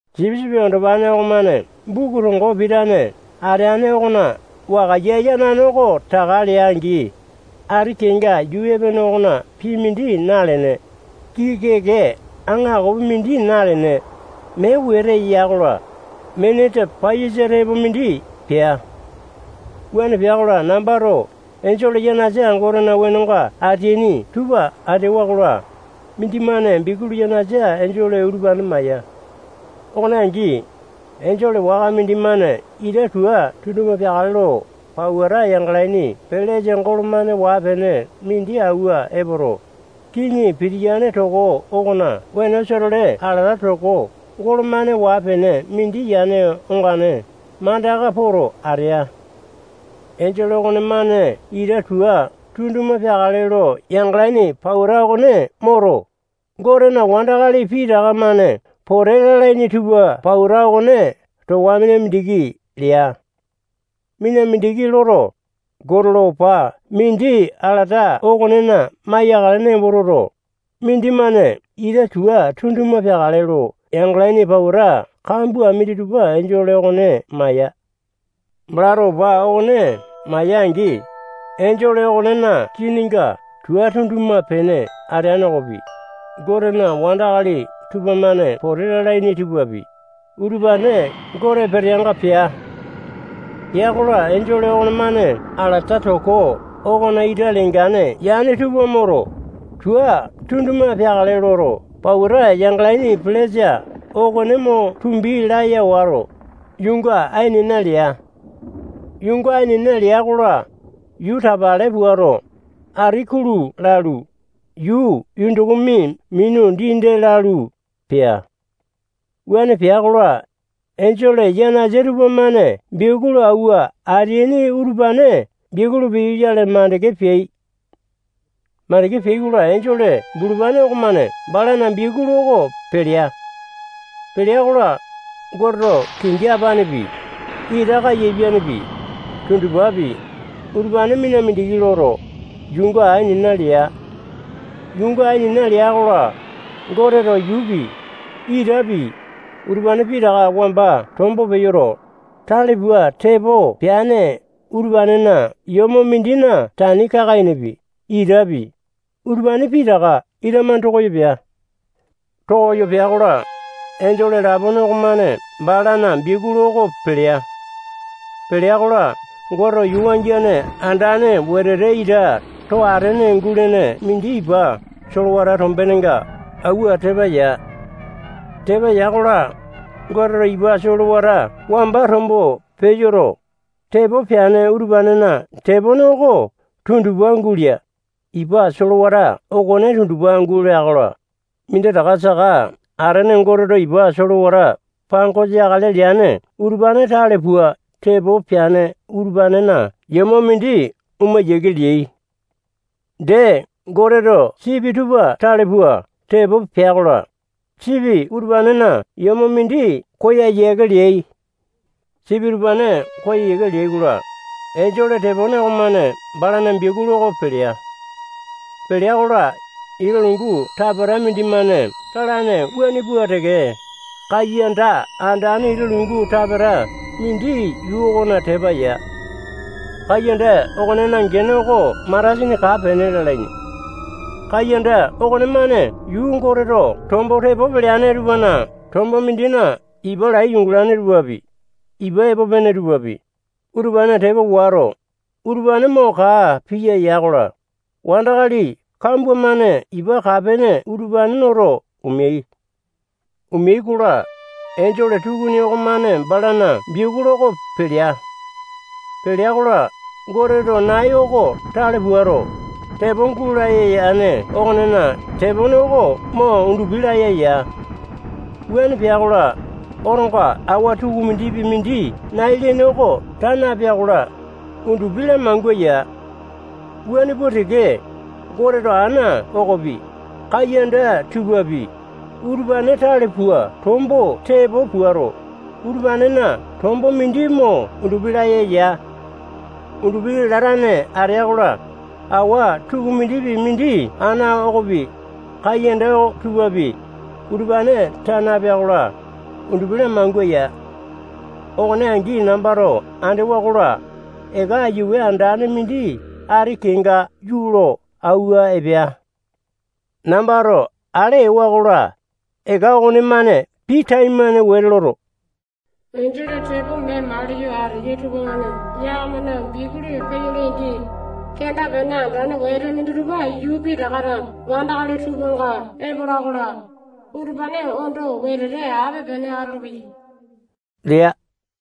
Sipisipi Andopane okomane buku tongo pitane ateane okona wakaiya yanane oko taka lea-angi, ati kenga yuu epene okona pii mindi nalene, kiki-keke aŋakopi mindi nalene, mee wete ya-kola, miniti paiyasa tepopi mindi pea. Wuane pea-kola, nambato enjole yanasa Gotena wenonga ateaini tupa andewa-kola, mindimane biakulu yanasa enjole utupane maya. Okone angi, enjole waka mindimane ita tua tunduma peakale lo pauta yangalaini pelesa golo-mane waa-pene mindi awua epoto, kiŋi pitiyane toko okona wenosa-tole alata toko golo-mane waa-pene mindi yane ongane mandaka poto atea. Enjole okonemane ita tua tunduma peakale lo yangalaini pauta okone moto, Gotena wandakali pitaka-mane pote lalaini tupa pauta okone towa mina mindiki lea. Mina mindiki loto, Gote lo opa mindi alata okonena maiyakale nembo toto, mindimane ita tua tunduma peakale lo yangalaini pauta kambua minditupa enjole okone maya. Balato opa okone maya-angi, enjole okonena kininga tua tunduma-pene ateane okopi, Gotena wandakali tupamane pote lalaini tupapi, utupane Gote peteanga pea. Pea-kola, enjole okonemane alata toko okona ita lengane yane tupa moto, tua tunduma peakale loto pauta yangalaini pelesa okone mo tumbi laya wato, yuunga ainena lea. Yuunga ainena lea-kola, yuu tapale puato, ati kulu lalu, yuu yundukumi minu dii-dee lalu, pea. Wuane pea-kola, enjole yanasa tupamane biakulu auwa ateaini utupane biakulu peyoyale makande peai. Makande peai-kola, enjole bulupane okomane balana biakulu oko pelea. Pelea-kola, Goteto kingi apanepi, ita kaiyapianepi, tundupapi, utupane mina mindiki loto, yuunga ainena lea. Yuunga ainena lea-kola, Goteto yuupi, itapi, utupane pitaka wamba tombo peyoto, tale pua tepo peane utupanena yomo mindina tani kaka-enepi, itapi, utupane pitaka ita-mane tokoyo pea. Tokoyo pea-kola, enjole lapone okomane balana biakulu oko pelea. Pelea-kola, Goteto yuu wangiane andane wetete ita too atene gulene mindi ipa solewata tombenenga auwa tepa ya. Tepa ya-kola, Goteto ipa solewata wamba tombo peyoto, tepo peane utupanena tepone oko tundupa gulea. Ipa solewata okone tundupa gulea-kola, minditaka saka atene Goteto ipa solewata pangosa yakale leane utupane tale pua tepo peane utupanena yomo mindi oma yiake leai. Dee, Goteto sipi tupa tale pua tepo pea-kola, sipi utupanena yomo mindi koya yiake leai. Sipi utupane koya yiake leai-kola, enjole tepone okomane balana biakulu oko pelea. Pelea-kola, ita lungu tapata mindimane talane wuane pua teke, kaiyanda andane ita lungu tapeta mindi yuu okona tepa ya. Kaiyanda okonena gene oko matasini kaa-pene lalaini. Kaiyanda okonemane yuu Goteto tombo tepo peleane tupana tombo mindina ipa lai yungalane tupapi, ipa epo pene tupapi, utupanena tepa wato, utupane mo kaa piya ya-kola, wandakali kambua-mane ipa kaa-pene utupane noto omeai. Omeai-kola, enjole tukuni okomane balana biakulu oko pelea. Pelea-kola, Goteto nai oko tale puato, tepo gulaya yane okonena tepone oko mo undupi laya ya. Wuane pea-kola, otonga awa tukumindipi mindi nai lene oko taa napea-kola, undupi lamangua ya. Wuane pua teke, Goteto ana okopi, kaiyanda tupapi, utupane tale pua tombo tepo puato, utupanena tombo mindi mo undupi laya ya. Undupi latane atea-kola, awa tukumindipi mindi ana okopi, kaiyanda tupapi, utupane taa napea-kola, undupi lamangua ya. Okone angi nambato andewa-kola, eka aiyawe andane mindi ati kenga yuu lo awua epea. Nambato ale ewa-kola, eka okonemane pii taimane wete loto, enjole tepo mee maliyo ateyai tupamane yakamana biakulu peyolai-angi, kenda-pene andane wete minditupa yuu pitakana wandakali tupanga epola-kola, utupane ondo wetete ape-pene atolopeyai lea.